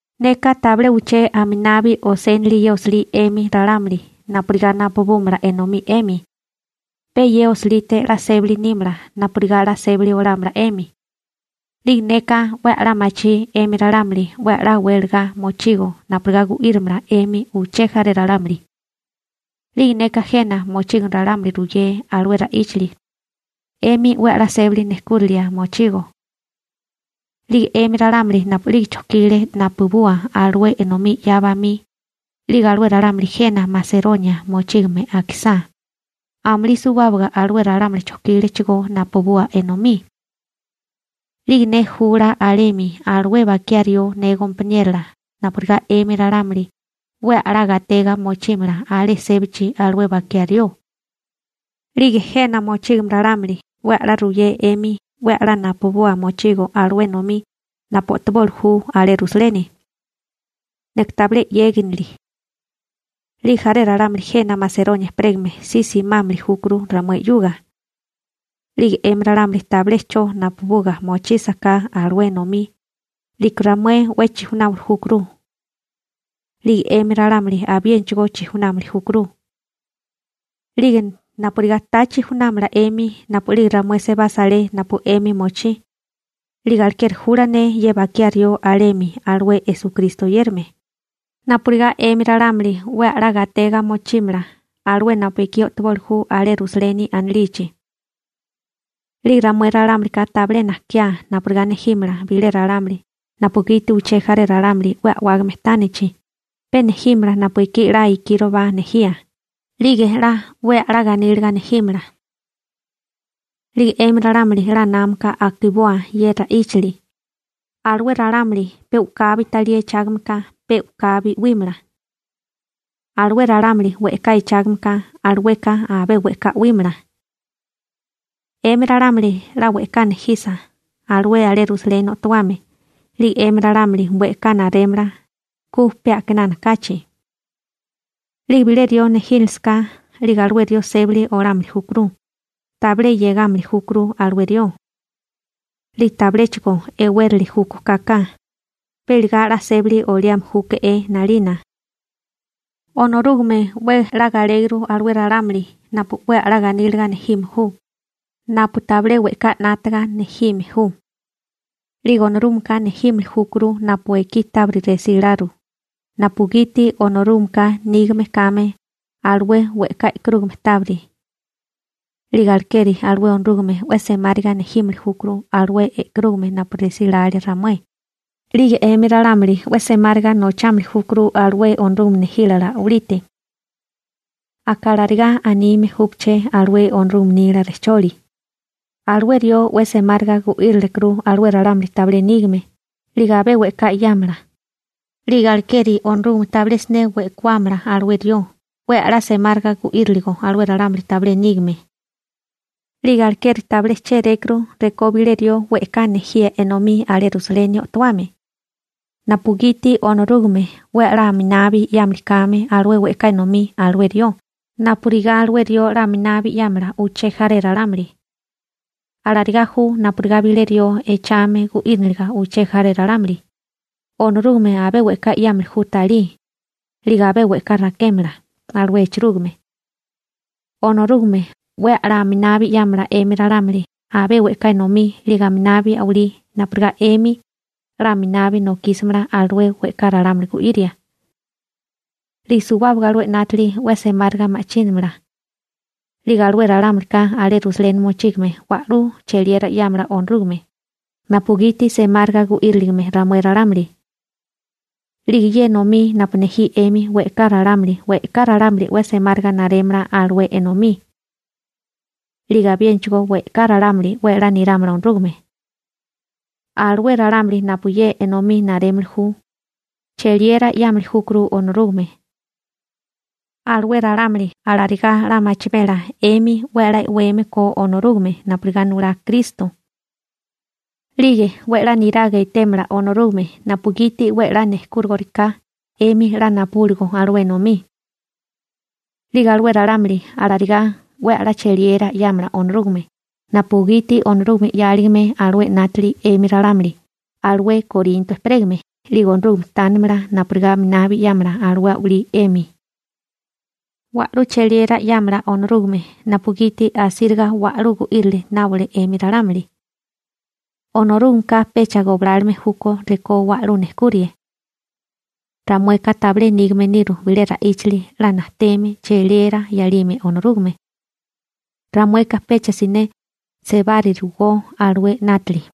Neka tabilé uché aminabi osénili ye osilí 'emi ralámuli napurigá napubúmala enomí 'emi. Pe ye osilite 'la sébali nímala napurigá 'la sébali olámala 'emi. 'Lige neka 'we a'lá machí 'emi ralámuli 'we a'lá welagá mochigo napurigá gu'írimala 'emi uché jaré ralámuli. 'Lige neka jena mochígame ralámuli ruyé alué ra'íchali 'emi 'we a'lá sébali nejkúrinilia mochigo. 'Lige 'emi ralámuli napu'lige chojkile napubua alué enomí 'ya bamí, 'lige alué ralámuli jena Maseronia mochígame akisá, amulí suwábaga alué ralámuli chojkílechigó napubua enomí. 'Lige ne jula alemi alué bakiá rió ne gompaniérola napurigá 'emi ralámuli 'we a'lá gatega mochímala alé sébachi alué bakiá rió. 'Lige jena mochígame ralámuli 'we a'lá ruyé 'emi 'we a'lá napubua mochigo alué enomí napu o'toboli ju alé Rusaleni. Neka tabilé 'yegánili. 'Lige jaré ralámuli jena Maseronia ejperégame si simámili júkuru ramué 'yuga. 'Lige 'emi ralámuli tabilé 'cho napubuga mochísaká alué enomí, 'liko ramué 'we chijunáwili júkuru. 'Lige 'emi ralámuli abiénachigó chijunámili júkuru. 'Lige napurigá ta chijunámala 'emi napu'lige ramué sebasa alé napu 'emi mochí, 'lige alekeri jula ne ye bakiá rió alemi alué Esukristo oyérame, napurigá 'emi ralámuli 'we a'lá gatega mochímala alué napu ekí o'toboli ju alé Rusaleni anilichi. 'Lige ramué ralámulika tabilé najkiá napurigá nejímala bilé ralámuli napugiti uché jaré ralámuli 'we a'wágame tánichi, pe nejímala napu ekí 'la ikíroba nejía, 'lige 'la 'we a'lá ganíliga nejímala. 'Lige 'emi ralámuli 'la námaka akiboa ye ra'íchali: Alué ralámuli pe u'kabi talí echágame ka, pe u'kabi 'wímala. Alué ralámuli we'ká echágame ka, alueka abé we'ká 'wímala. 'Emi ralámuli 'la we'ká nejisa alué alé Rusaleni o'towame, 'lige 'emi ralámuli we'ká narémala ku pe a'kinana kachi. 'Lige bilé rió nejínilisaká, 'lige alué rió sébali olámili júkuru, tabilé 'yegámili júkuru alué rió. 'Lige tabiléchigo e'wérili júkó kaka, pe iligá 'la sébali oliame júke'é 'nalina. Onorúgame 'we 'la galéguru alué ralámuli napu 'we a'lá ganíliga nejime ju, napu tabilé we'ká 'nátaga nejime ju. 'Lige Onorúgameka nejímili júkuru napu ekí tábiri resí laru, napugiti Onorúgameka nígame kame alué we'ká e'karúgame tábiri. 'Lige alekeri alué Onorúgame 'we semáriga nejímili júkuru alué e'karúgame napu resí lalia ramué, 'lige 'emi ralámuli 'we semáriga nochámili júkuru alué Onorúgame nejílala a'walite. Aka alarigá anime júpaché alué Onorúgame nila rejcholi: Alué rió 'we semáriga gu'írilekuru alué ralámuli tabilé nígame, 'lige abé we'ká 'yámala. 'Lige alekeri Onorúgame tabilé siné we'kawámala alué rió 'we 'la semáriga gu'íriligo alué ralámuli tabilé nígame. 'Lige alekeri tabilé chérékuru rekó bilé rió we'ká nejíe enomí alé Rusaleni o'towame, napugiti Onorúgame 'we a'lá aminabi 'yámili kame alué we'ká enomí alué rió napurigá alué rió 'la aminabi 'yámala uché jaré ralámuli. Alarigá ju napurigá bilé rió echame gu'íriniliga uché jaré ralámuli, Onorúgame abé we'ká 'yámili ju talí, 'lige abé we'ká rakémala alué echarúgame. Onorúgame 'we a'lá aminabi 'yámala 'emi ralámuli abé we'ká enomí 'lige aminabi a'walí napurigá 'emi 'la aminabi nokísimala alué we'ká ralámuli gu'iria. 'Lige suwábaga alué 'nátili 'we semáriga ma'chínamala. 'Lige alué ralámulika alé Rusaleni mochígame wa'lú cheliera 'yámala Onorúgame, napugiti semáriga gu'íriligime ramué ralámuli. 'Lige ye enomí napu nejí 'emi we'ká ralámuli, we'ká ralámuli 'we semáriga narémala alué enomí. 'Lige abiénachigó we'ká ralámuli 'we 'la nirámala Onorúgame. Alué ralámuli napu ye enomí narémili ju, cheliera 'yámili júkuru Onorúgame. Alué ralámuli alarigá 'la machimela 'emi 'we 'la e'weme ko Onorúgame napurigá nulá Kristo. 'Lige 'we 'la niraga etémala Onorúgame napugiti 'we 'la nejkúrigoriká 'emi 'la napubúligo alué enomí. 'Lige alué ralámuli alarigá 'we a'lá cheliera 'yámala Onorúgame napugiti Onorúgame 'yáligame alué 'nátili 'emi ralámuli alué Korinto ejperégame 'lige Onorúgame tánimala napurigá aminabi 'yámala alué a'walí 'emi. Wa'lú cheliera 'yámala Onorúgame napugiti asíriga wa'lú gu'írili nábole 'emi ralámuli. Onorúgameka pecha goblálome júkó rekó wa'lú nejkurie. Ramueka tabilé nígame niru bilé ra'íchali 'la najteme cheliera 'yalime Onorúgame. Ramueka pecha siné sebárirugó alué 'nátili.